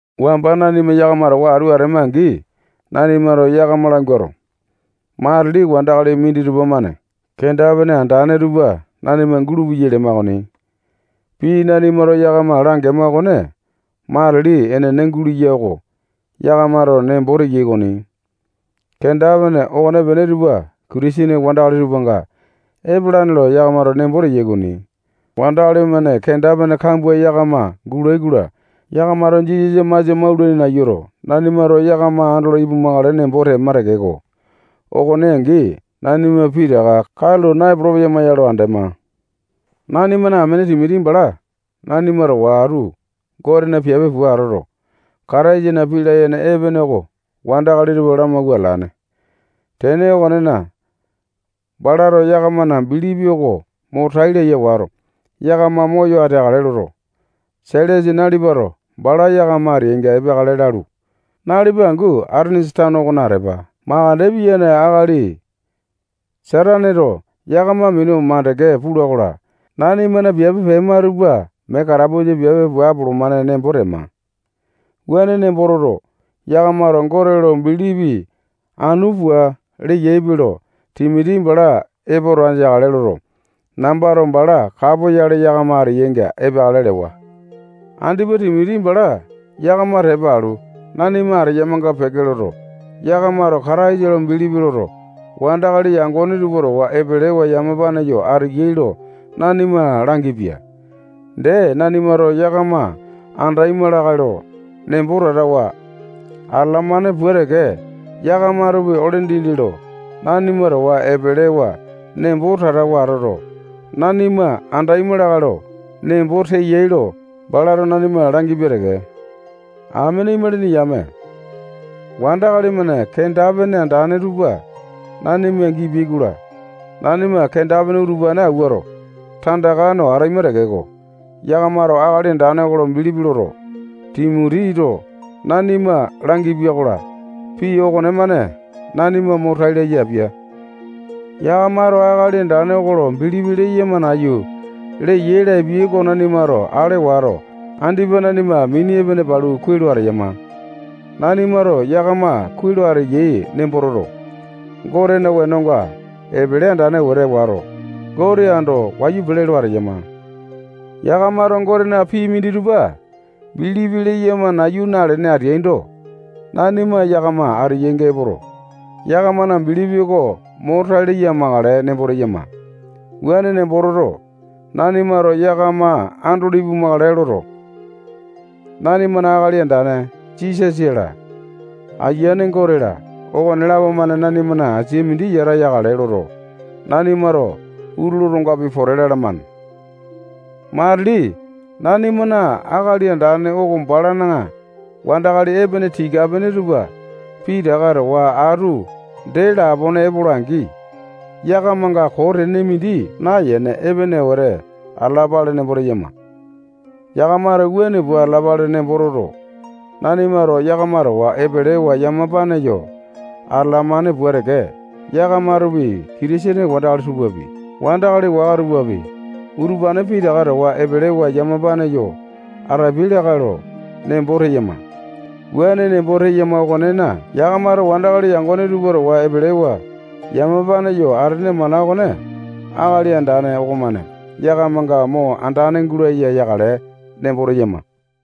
Wamba nanima yakama towa atu atema-angi, nanimato yakama languato, matili wandakali minditupa-mane kenda-pene andane tupa nanima gulupeyai lema okoni. Pii nanimato yakama langema okone matili enene gulea oko yakamato nembo teyai okoni. Kenda-pene okonepene tupa Kitisene wandakali tupanga epalane lo yakamato nembo teyai okoni. Wandakali-mane kenda-pene kambua yakama gulai-kola, yakamato Jisasa masia maulaini nayuto, nanimato yakama andolo ipumakale nembo tema tekeko, okone angi nanima pitaka katulo naepolo-peyama ya lo andema. Nanimana amene Timoti bala nanima towa atu Gotena piape pua atoto, Kataisana pii layene epene oko wandakali tupa lamawua atalane. Tene okonena, balato yakamana bilipi oko mo tai laya wato, yakama moyo ateakale loto, Sailasa nalipato bala yakama ateyainga epeakale lalu, nalipa angu Atenesa tano okona atepa. Makande piyane akali Sataneto yakama minu mandeke pula-kola, nanimana piape pema tupa mee katapusa piape pua apolomane nembo tema. Wuane nembo toto, yakamato Gote lo bilipi anu pua leyaipe lo Timoti bala epoto andeakale loto, nambato bala kapoyale yakama ateyainga epeakale lewa. Andipa Timoti bala yakama tepa alu, nanima ateyamanga peke loto, yakamato Kataisa lo bilipi loto, wandakali yangone tupa towa epelewa yamapane yo ateyai lo nanima langipia. Dee, nanimato yakama andaima lakae lo nembo tatawa atalamane pua teke, yakamatopi ole dindi lo nanima towa epelewa nembo tatawa atoto, nanima andaima lakae lo nembo teyai lo balato nanima langipia teke. Amene imalini yame, wandakali-mane kenda-pene andane tupa nanima gipia-kola, nanima kenda-pene utupane awuato, tandaka no ataima tekeko, yakamato Akali Andane oko lo bilipi loto, Timotito nanima langipia-kola, pii okonemane nanima mo tai laya apia. Yakamato Akali Andane oko lo bilipi leyama nayu leyai lapia oko nanimato ale wato, andipa nanima mini epene palu kuai lo ateyama. Nanimato yakama kuai lo ateyai nembo toto, Gotena wenonga epele andane wete wato, Gote ando wayu wete pele lo ateyama. Yakamato Gotena pii minditupa bilipi leyama nayu nalene ateaindo, nanima yakama ateyainga epoto, yakamana bilipi oko mo tai laya amakale nembo teyama. Wuane nembo toto, nanimato yakama andolo ipumakale loto, nanimana Akali Andane Jisasa-la, Ayiane Gote-la, okonelapo-mane nanimana asia mindi yata yakale loto, nanimato utulu otongapi pote lalamane. Matili nanimana Akali Andane oko balana wandakali epene tika-pene tupa pitaka towa atu dee lapone epola-angi, yakamanga koo tene mindi nayene, epene wete atalapale nembo teyama. Yakamato wuane pua atalapale nembo toto, nanimato yakama towa epelewa yamapane yo atalamane pua teke, yakamatopi Kitisene wandakali tupapi, wandakali waka tupapi, utupane pitaka towa epelewa yamapane yo atapiai lakae lo nembo teyama. Wuane nembo teyama okonena, yakamato wandakali yangone tupa towa epelewa yamapane yo atene mana okone Akali Andane okomane yakamanga mo andane gulaya yakale nembo teyama.